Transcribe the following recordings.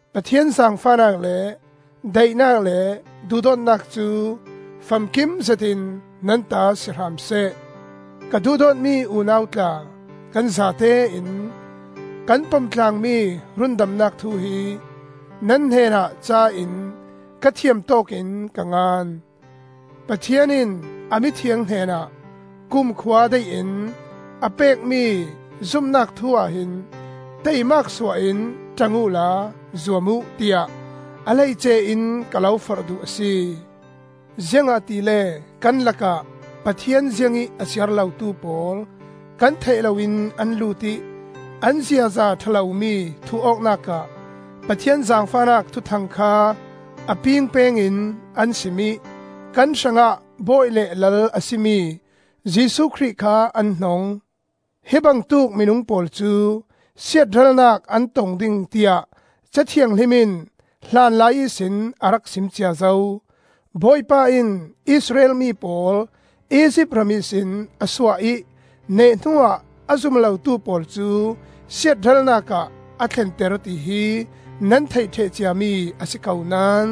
Pathian zaangfahnak le daihnak le duhdawtnak cu famkim zetin nan ta si hram seh. Ka duhdawtmi unau tla, kan zatein kan pomtlaangmi rundamnak thu hi nan hnenah ca in ka thiam tawkin ka ngan; Pathian in a mithiang hnenah kumkhua daihin a pekmi zumnak thu ahhin taimak suah in ṭang uhla zuam uh tiah a hleice in ka lo forh duh a si. Ziangahtile kan lakah Pathian ziangih a siar lotu pawl kan theih loin an lut ih an ziaza ṭha lomi thuh awknak ah Pathian zaangfahnak thuthang kha a pingpeng in an sim ih kan hrangah Bawi le Lal a si mi Jesuh Khrih kha an hnong. Hi bangtuk minung pawl cu siatralnak an tong ding tiah Ca Thianghlim in hlanlai ihsin a rak sim cia zo. Bawipa in Israel mi pawl Izipt ram ihsin a suah ih neh hnuah a zum lotu pawl cu siatralnak ah a thlenter ti hi nan theih ṭheh ciami a si ko naón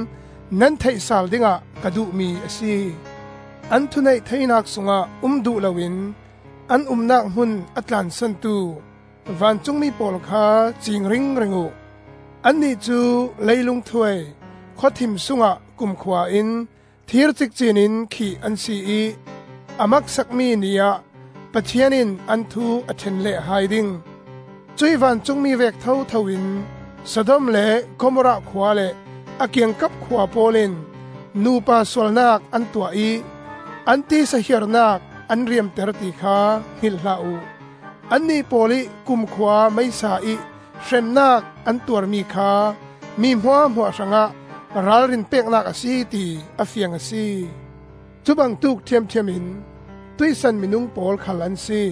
nan theih sal dingah ka duhmi a si. An thuneih theinak sungah um duh loin an umnak hmun a tlansantu vancungmi pawl kha ciing ringring uh. Annih cu leilung thuai khawthim sungah kumkhua in thir cikcin in khih an si ih a maksakmi Ni ah Pathian in an thu a ṭhen leh hai ding. Cuih vancungmi vek thothoin Sodom le Gomorrah khua le a kiangkap khua pawl in nupa sualnak an tuah ih an tisa hiarnak an riamter ti kha hngilh hlah uh: annih pawl ih kumkhua meisa ih hremnak an tuarmi kha mi hmuahhmuah hrangah ralrin peknak a si ti a fiang a si. Cubangtuk ṭhiamṭhiam in tuihsan minung pawl khal an si: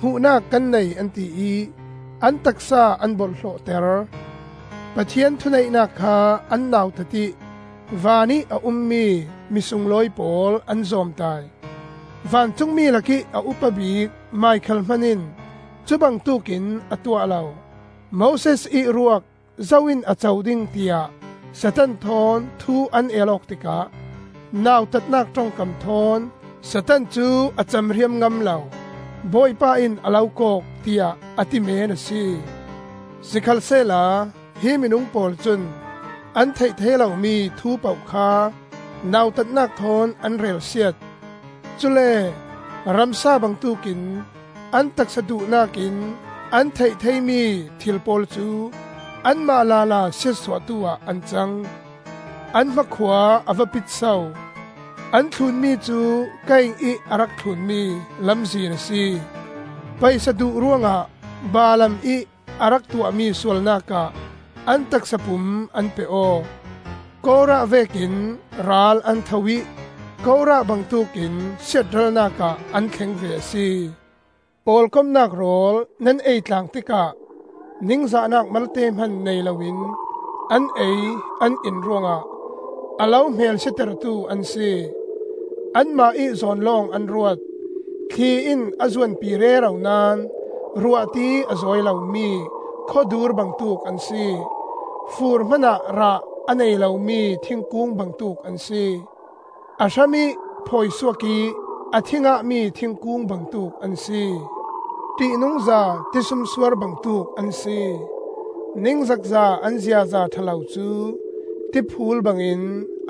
hmuhnak kan nei an ti ih an taksa an borhhlawhter; Pathian thuneihnak kha an nautat ih vanih a ummi mi sunglawi pawl an zawmtai. Vancungmi lakih a upa bik Mikhael hman in cubangtuk in a tuah lo. Moses ih ruak zo in a co ding tiah Satan thawn thu an el awk tikah nautatnak ṭongkam thawn Satan cu a camriam ngam lo; “Bawipa in a lo kawk!” tiah a ti meen a si. Sikhalsehla hi minung pawl cun an theih thei lomi thu poh kha nautatnak thawn an relsiat. Cule ramsa bangtuk in an taksa duhnak in an theih theimi thil pawl cu anmah lala siatsuahtu ah an cang. An hmakhua a va pit so! An thlunmi cu Kain ih a rak thlunmi lamzin a si. Paisa duh ruangah Balaam ih a rak tuahmi sualnak ah an taksa pum an pe aw. Korah vekin ral an tho ih Korah bangtuk in siatralnak ah an thleng ve a si. Pawlkomnak rawl nan eitlaang tikah ningzahnak malte hman nei loin an ei an in ruangah a lo hmelsia tertu an si. Anmah ih zawn lawng an ruat. Thli in a zuanpi rero naón ruahti a zawi lomi khawdur bangtuk an si. Fur hmanah rah a nei lomi thingkung bangtuk an si; a hramih phawi suak ih a thi ngahmi thingkung bangtuk an si. Ṭihnungza tisumsuar bangtuk an si; ningzakza an ziaza ṭha lo cu tiphuul bangin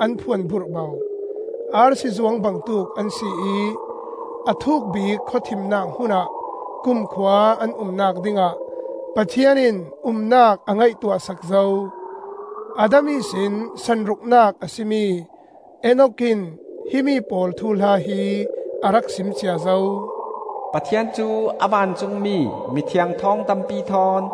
an phuan burhbo; arsi zuang bangtuk an si ih a thuk bik khawthimnak hmunah kumkhua an umnak dingah Pathian in umnak a ngaihtuah sak zo. Adam ihsin sanruknak a si mi Enok in himi pawl thuhla hi a rak sim cia zo. “Pathian cu a vancungmi, mithiang thawng tampi thawn,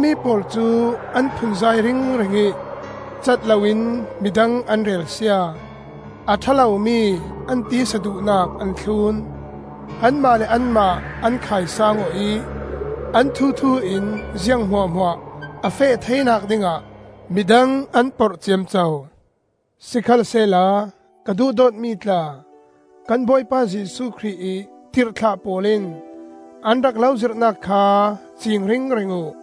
Himi pawl cu an phunzai ringring ih catloin midang an relsia, a ṭha lomi an tisa duhnak an thlun; anmah le anmah an khaisaang aw ih an thuthu in ziang hmuahhmuah a feh theinak dingah midang an porh ciamco. Sikhalsehla ka duhdawtmi tla, kan Bawipa Jesuh Khrih ih tirhthlah pawl in an rak lo zirhnak kha ciing ringring uh.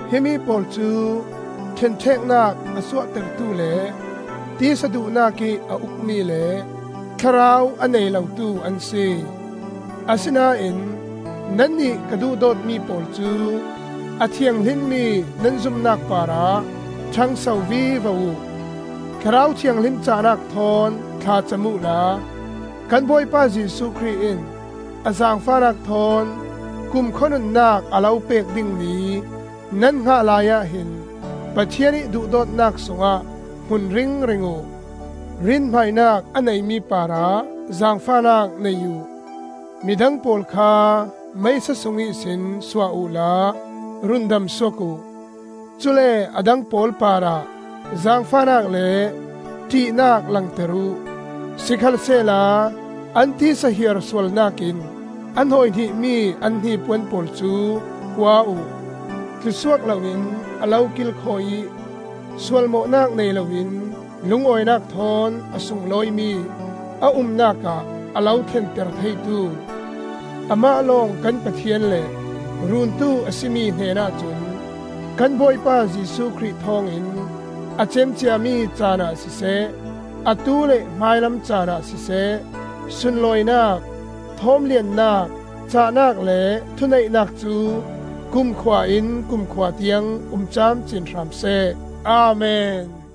Himi pawl cu ṭhenṭheknak a suahtertu le tisa duhnak ih a ukmi le Thlarau a nei lotu an si. Asinain nannih ka duhdawtmi pawl cu a thianghlimmi nan zumnak parah ṭhangso vivo uh. Thlarau Thianghlim cahnak thawn thla cam uhla, kan Bawipa Jesuh Khrih in a zaangfahnak thawn kumkhua nunnak a lo pek ding ni nan hngah laiah hin Pathian ih duhdawtnak sungah hmun ringring uh. Rinhmainak a neimi parah zaangfahnak nei uh; midang pawl kha meisa sung ihsin suah uhla rundam suak uh; cule a dang pawl parah zaangfahnak le ṭihnak langter uh, sikhalsehla an tisa hiar sualnak in a hnawihnihmi an hnipuan pawl cu hua uh. Tlu suak loin a lo kilkhawi ih sualmawhnak nei loin lungawinak thawn a sunglawimi a umnak ah a lo thlenter theitu, amah lawng kan Pathian le Runtu a si mi hnen ahcun, kan Bawipa Jesuh Khrih thawngin a cem ciami caan ah siseh, atu le hmailam caanah siseh, sunlawinak, thawmliannak, cahnak le thuneihnak cu kumkhua in kumkhua tiang um camcin hram seh. Amen.